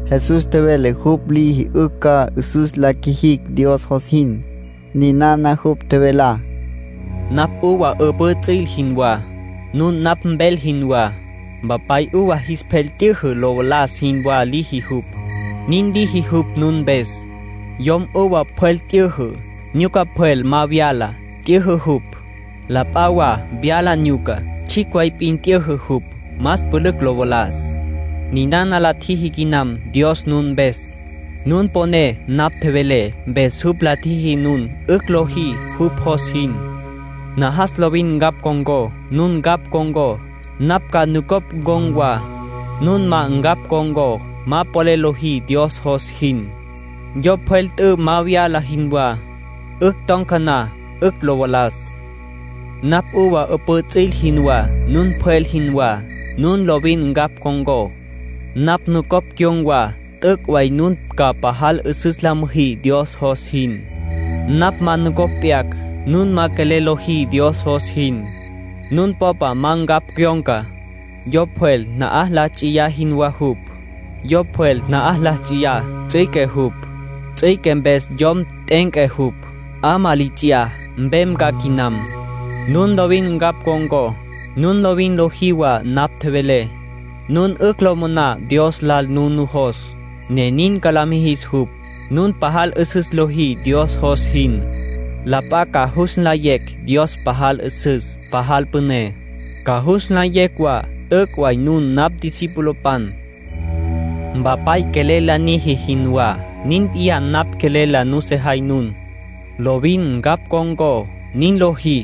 Jesús tjevele jupj liji 'ücj ca 'üsüs la qjuijicj Dios jos jin. Ninana jupj tjevelá: —Napj uva 'üpǘ ts'il jinwá. Nun napj mpjel jinwá. Mpapay uva jis pjel t'yüjü lo valas jinwá liji jupj. Nin liji jupj nun mpes. Yom uva pjwel t'yüjü, nyuca pjwel ma vyala, t'yüjü jupj. La p'a wa vyala nyuca, tsjicj way p'in t'yüjü jupj, más pülücj lo valas. Ninana la tjiji quinam Dios nun mpes. Nun toponé napj tjevelé, mpes jupj la tjiji nun 'ücj lojí jupj jos jin. Najas lovin ncapj ncon̈có. Nun ncapj con̈có, napj ca nucopj ncon̈ wa. Nun ma ncapj con̈có, ma polel lojí Dios jos jin, yo pjwel t'ü ma vyala jinwá. 'Ücj ton̈ca na, 'ücj lo valas. ”Napj uva 'üpǘ ts'il jinwá. Nun mpjel jinwá. Nun lovin ncapj con̈có, napj nucopj cyon̈ wa, t'üc' way nun ca pajal 'üsüs la müjí Dios jos jin. Napj ma nucopj p'yacj, nun ma polel lojí Dios jos jin. Nun popa ma ncapj cyon̈ca, yo pjwel na'aj la ts'iya jinwá jupj. Yo pjwel na'aj la ts'iya, ts'üique jupj. Ts'üique mpes yom t'e'enca jupj, 'amá li ts'iyá, mpem ca quinam. ”Nun lovin ncapj con̈có, nun lovin lojí wa napj tjevelé, nun 'ücj lo moná Dios lal nun nujos, ne nin ca la mijis jupj. Nun pajal 'üsüs lojí Dios jos jin, la p'a ca jus nlayecj Dios pajal 'üsüs, pajal püné. Ca jus nlayecj wa t'üc' way nun napj discipulopan. Mpapay quelel la niji jinwá, nin p'iyá napj quelel la nusejay nun. Lovin ncapj ncon̈có; nin lojí,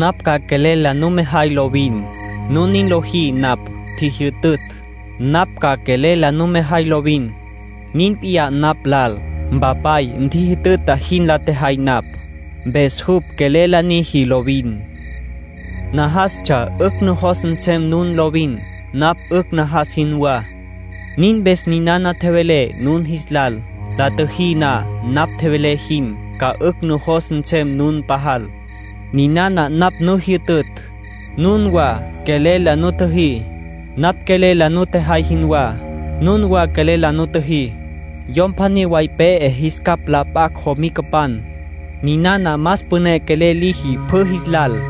napj ca quelel la numejay lovin. Nun nin lojí napj tjijyütütj, napj ca quelel la numejay lovin. Nin p'iyá napj lal. Mpapay ntjijütüta jin la tjejay napj, mpes jupj quelel la niji lovin. ”Najastsja 'ücj nujos nsem nun lovin, napj 'ücj najas jinwá. Nin mpes ninana tjevelé nun jis lal. La tjüjí na napj tjevelé jin, ca 'ücj nujos nsem nun pajal. Ninana napj nu jyütütj: nunwa quelel la nutjüjí. Napj quelel la nutjejay jinwá, nunwa quelel la nutjüjí. Yom pjaní way pe'e jis capj la p'acj jomicapan, ninana más püné quelel liji pjü jis lal.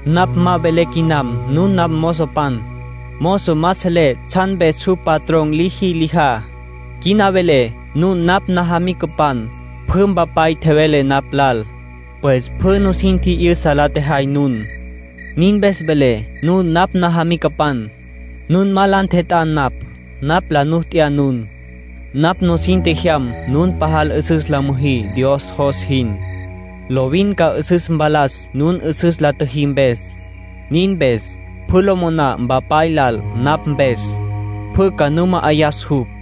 Napj ma velé quinam nun napj namozopan. Mozo ma selé tsjan mpes jupj patrón liji lijá. Quina velé nun napj najamicapan. Pjü Mpapay tjevele napj lal, pues pjü nusin tji'yüsa la tjejay nun. Nin mpes velé nun napj najamicapan. ”Nun ma la ntjet'á napj. Napj la nu t'ya nun. Napj nusin tjejyam nun pajal 'üsüs la müjí Dios jos jin. Lovin ca 'üsüs mpalas nun 'üsüs la tjüjí mpes. Nin mpes, pjü lo moná Mpapay lal napj mpes, pjü ca nu ma'ayas jupj.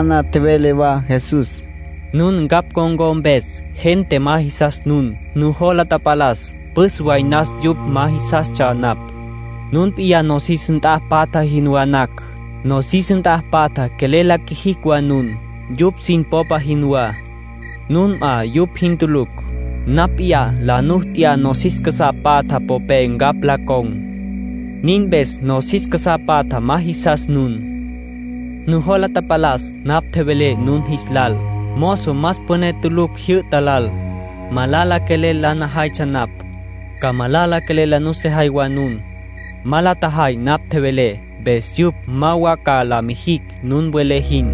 Ninana tjevele wa Jesús: —Nun ncapj con̈có mpes, gente ma jisas nun. Nujola tapalas püs way nas yupj ma jisastsja napj. Nun p'iyá nosis nt'a patja jinwá nacj, nosis nt'a patja quelel la quijicj wa nun, yupj sin popa jinwá. Nun 'a yupj jin tulucj. Napj p'iyá la nu t'ya nosis casá patja popé ncapj la con̈. Nin mpes nosis casá patja ma jisas nun. Nujola tapalas napj tjevelé nun jis lal: ‘Mozo más püné tulucj jyü'ta lal’. Malala quelel la najaytsja napj, ca malala quelel la nusejay wa nun. Ma la tjajay napj tjevelé, mpes yupj ma wa ca la mijicj nun welé jin.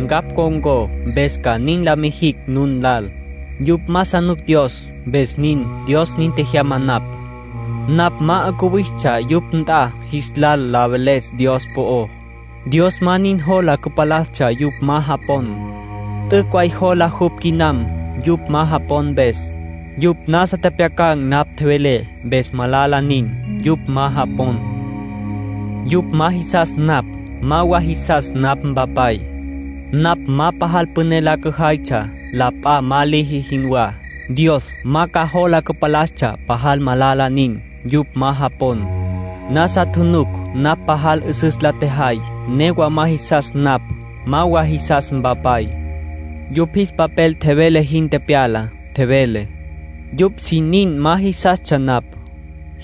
Ncapj con̈có, mpes ca nin la mijicj nun lal. Yupj ma sa nuc Dios, mpes nin. Dios nin tjejyama napj. ”Napj ma 'ucuwistsja yupj nt'a jis lal la veles Dios po'ó, Dios ma nin jola cüpalastsja yupj ma japon. T'üc' way jola jupj quinam yupj ma japon mpes. Yupj nasa tjepjyacan̈ napj tjevelé, mpes malala nin, yupj ma japon. Yupj ma jisas napj, ma wa jisas napj Mpapay. Napj ma pajal püné la cüjaytsja, la p'a ma liji jinwá, Dios ma ca jola cüpalastsja pajal malala nin, yupj ma japon. Nasa tjunuc napj pajal 'üsüs la tjejay, newa ma jisas napj, ma wa jisas Mpapay. Yupj jis papel tjevele jin tepyala. Tjevele: ‘Yupj sin nin ma jisastsja napj’.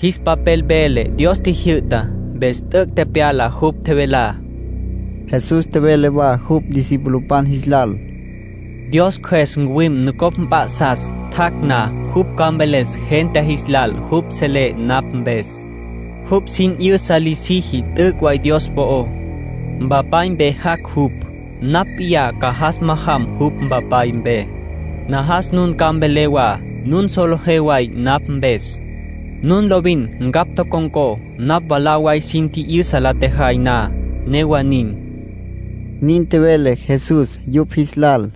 Jis papel vele Dios tjijyü'tá, mpes t'üc' tepyala jupj tjevelá —nin tjevele Jesús. Jesús tjevele wa jupj discipulopan jis lal: —Dios Cjües ncuwim nucopj mp'a'sas. Tjac' na, jupj ca mveles gente jis lal jupj selé napj mpes. Jupj sin 'yüsa la siji t'üc' way Dios po'ó. Mpapay mpe jac' jupj. Napj p'iyá ca jas majam jupj Mpapay mpe. Najas nun ca mvelé wa nun solejé way napj mpes. Nun lovin ncapj tocon̈có napj mwalá way sin tji'yüsa la tjejay na, newa nin —nin tjevele Jesús yupj jis lal.